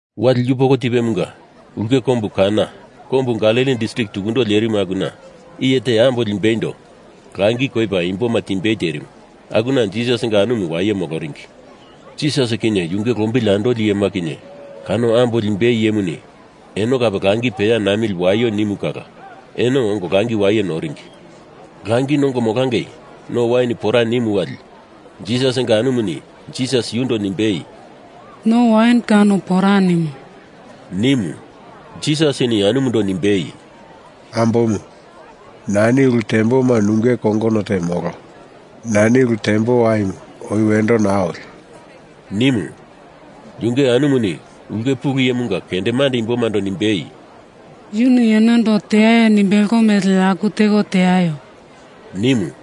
Wali yupoko tipemunga ulke kombu Kana kombu Galili distrik tukundo lerimu, akuna iye te ambo limbeindo langi koipa imboma timbei terimu, akuna Jisasinga anumu waye moloringi. Jisas kinye yunge lombili andoli iyema kinye kano ambo limbei iyemuni eno kape langi peya namili waio nimu kala eno ongo langi waye noringi. Langi nongo molangei no wain pora nimu wali Jisasinga anumuni Jisas yundo nimbei, “No wain kano pora nimo,” nimu. Jisasini anumundo nimbei, “Ambomu, nani ulu temboma nunge kongono te molo. Nani ulu tembo waimu oi wendo naa oli,” nimu. Yunge anumuni ulke pulu iyemunga kendemande imbomando nimbei, “Yuni enondo teaio nimbelo mele aku teko teaio!” nimu.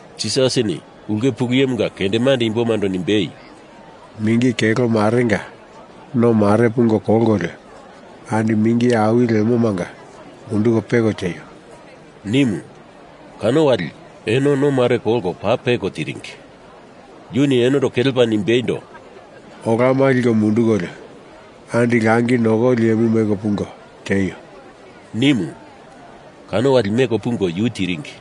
Jisasini ulke pulu iyemunga kendemande imbomando nimbei, “Mingi kelo marenga no mare pungo kolkolio, andi mingi awili lemomanga munduko peko tieio,” nimu. Kano wali eno no mare kolko paa peko tiringi. Yuni enondo kelepa nimbeindo, “Olama liko mundukolio andi langi nokoli iyemu meko pungo tieio,” nimu. Kano wali meko pungo yu tiringi.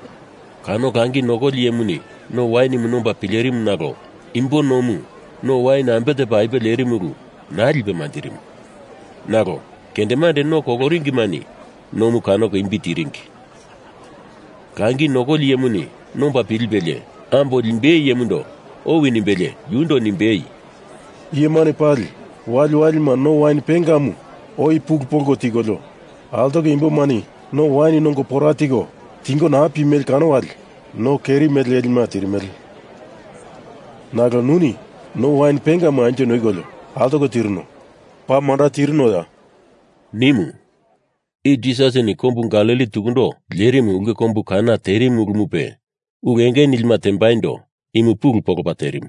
Kano langi nokoli iyemuni no wainimu nomba pilerimu nalo imbo nomu no wain ambe tepa apuwe lerimu ulu naa lipe manjirimu. Nalo kendemande no koloringimani nomu kanoko imbi tiringi. Langi nokoli iyemuni nomba pilipelie ambo limbei iyemundo owi nimbelie yundo nimbei, “Iyemani pali waliwalima no wain pengamu oi pulu polko tikolio, altoko imbomani no awini nongo pora tiko tingo naa pimele kano wali no keri mele lelima tirimele. Nalo nuni no wain pengamu anjo noikolio altoko tirino, paa manda tirinoya,” nimu. I Jisasini kombu Galili tukundo lerimu ulke kombu Kana terimu ulumupe ulu enge nilima tembaindo imu pulu polopa terimu.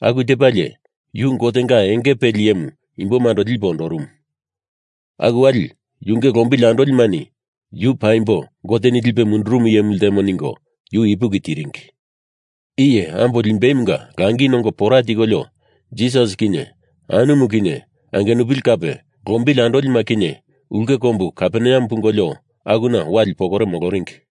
Aku tepalie, yu Gotenga enge peli iyemu imbomando lipe ondorumu. Aku wali yunge lombili andolimani Yu paimbo Goteni lipe mundurumu iyemu ltemo ningo yu ipuki tiringi. Iye ambo limbeimunga langi nongo pora tikolio Jisas kinye anumu kinye angenupili kape lombili andolima kinye ulke kombu Kaperneam pungolio, akuna wali pokore moloringi.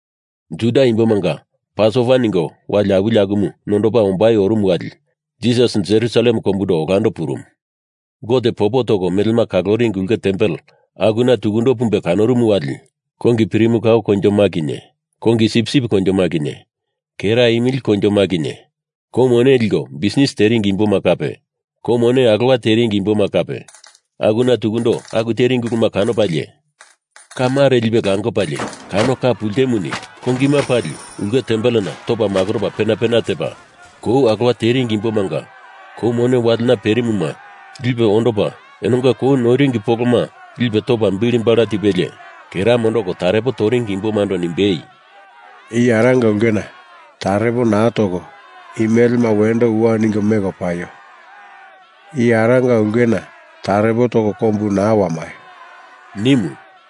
Juda imbomanga Pasova ningo wai awili akumu nondopa ombai orumu wali Jisas Jerusalem kombundo olando purumu. Gote popo toko melema kaloringi ulke tempel akuna tukundo pumbe kanorumu wali kongi pirimu kao koinjoma kinye kongi sipsip koinjoma kinye kera imili koinjoma kinye kou mone liko bisnis teringi imboma kape, kou mone alowa teringi imboma kape akuna tukundo aku teringi uluma kanopalie, ka mare lipe lakopalie kano ka pultemuni kongima pali ulke tempelena topa makoropa pena pena tepa, kou alowa teringi imbomanga kou mone walena perimuma lipe ondopa enonga kou noiringi poloma lipe topa bili bala tipelie, kera mondoko tarepo toringi imbomando nimbei “I Aranga ulkena tarepo naa toko i melema wendo uwa ningo, meko paio! I Aranga ulkena tarepo toko kombu naa wamaio,” nimu.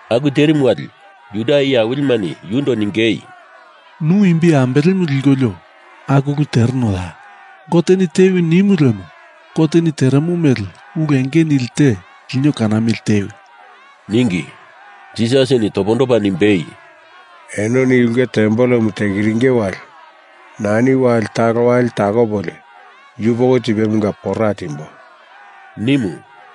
Aku terimu wali Juda iye awilimani yundo ningei, “Nu imbi ambelemu likolio aku ulu terenoya? Goteni tewi nimu lemo Goteni teremo mele ulu enge nili te lino kanamili tewi!” ningi. Jisasini topondopa nimbei, “Enoni i ulke tempelemu tekiringe wali nani wali talo wali takopolio yupoko tipemunga pora timbo,” nimu.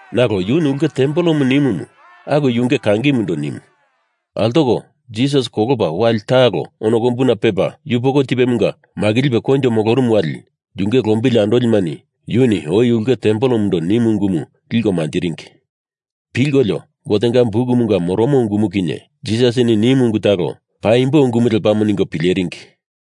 Nalo yuni ulke tempelemu nimu akumu yunge kangimundo nimu. Altoko Jisas kolopa wali talo ono kombuna pepa yupoko tipemunga makilipe koinjo molorumu wali yunge lombili andolimani yuni oi ulke tempelemundo nimu ungumu liko manjiringi. Pilkolio Gotenga Bukumunga moromo ungumu kinye Jisasini nimu ungu talo paimbo ungumu lepamo ningo pileringi.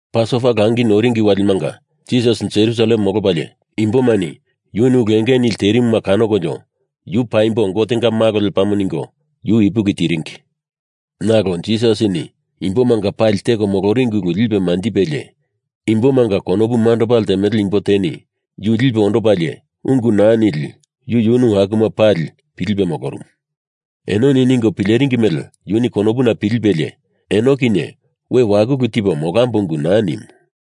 Pasova Langi Noringi Walimanga Jisas Jerusalem molopalie imbomani yuni ulu enge nili terimuma kanokolio Yu paimbo Gotenga Malo lepamo ningo yu ipuki tiringi. Nalo Jisasini imboma pali teko moloringi ulu lipe manjipelie imbomanga konopu mandopa ltemele imbo teni yu lipe ondopili ungu naa nili yu yunu akuma pali pilipe molorumu. Enoni ningo pileringi mele yuni konopuna pilipelie, eno kinye we wakulu tipo molambo ungu naa nimu.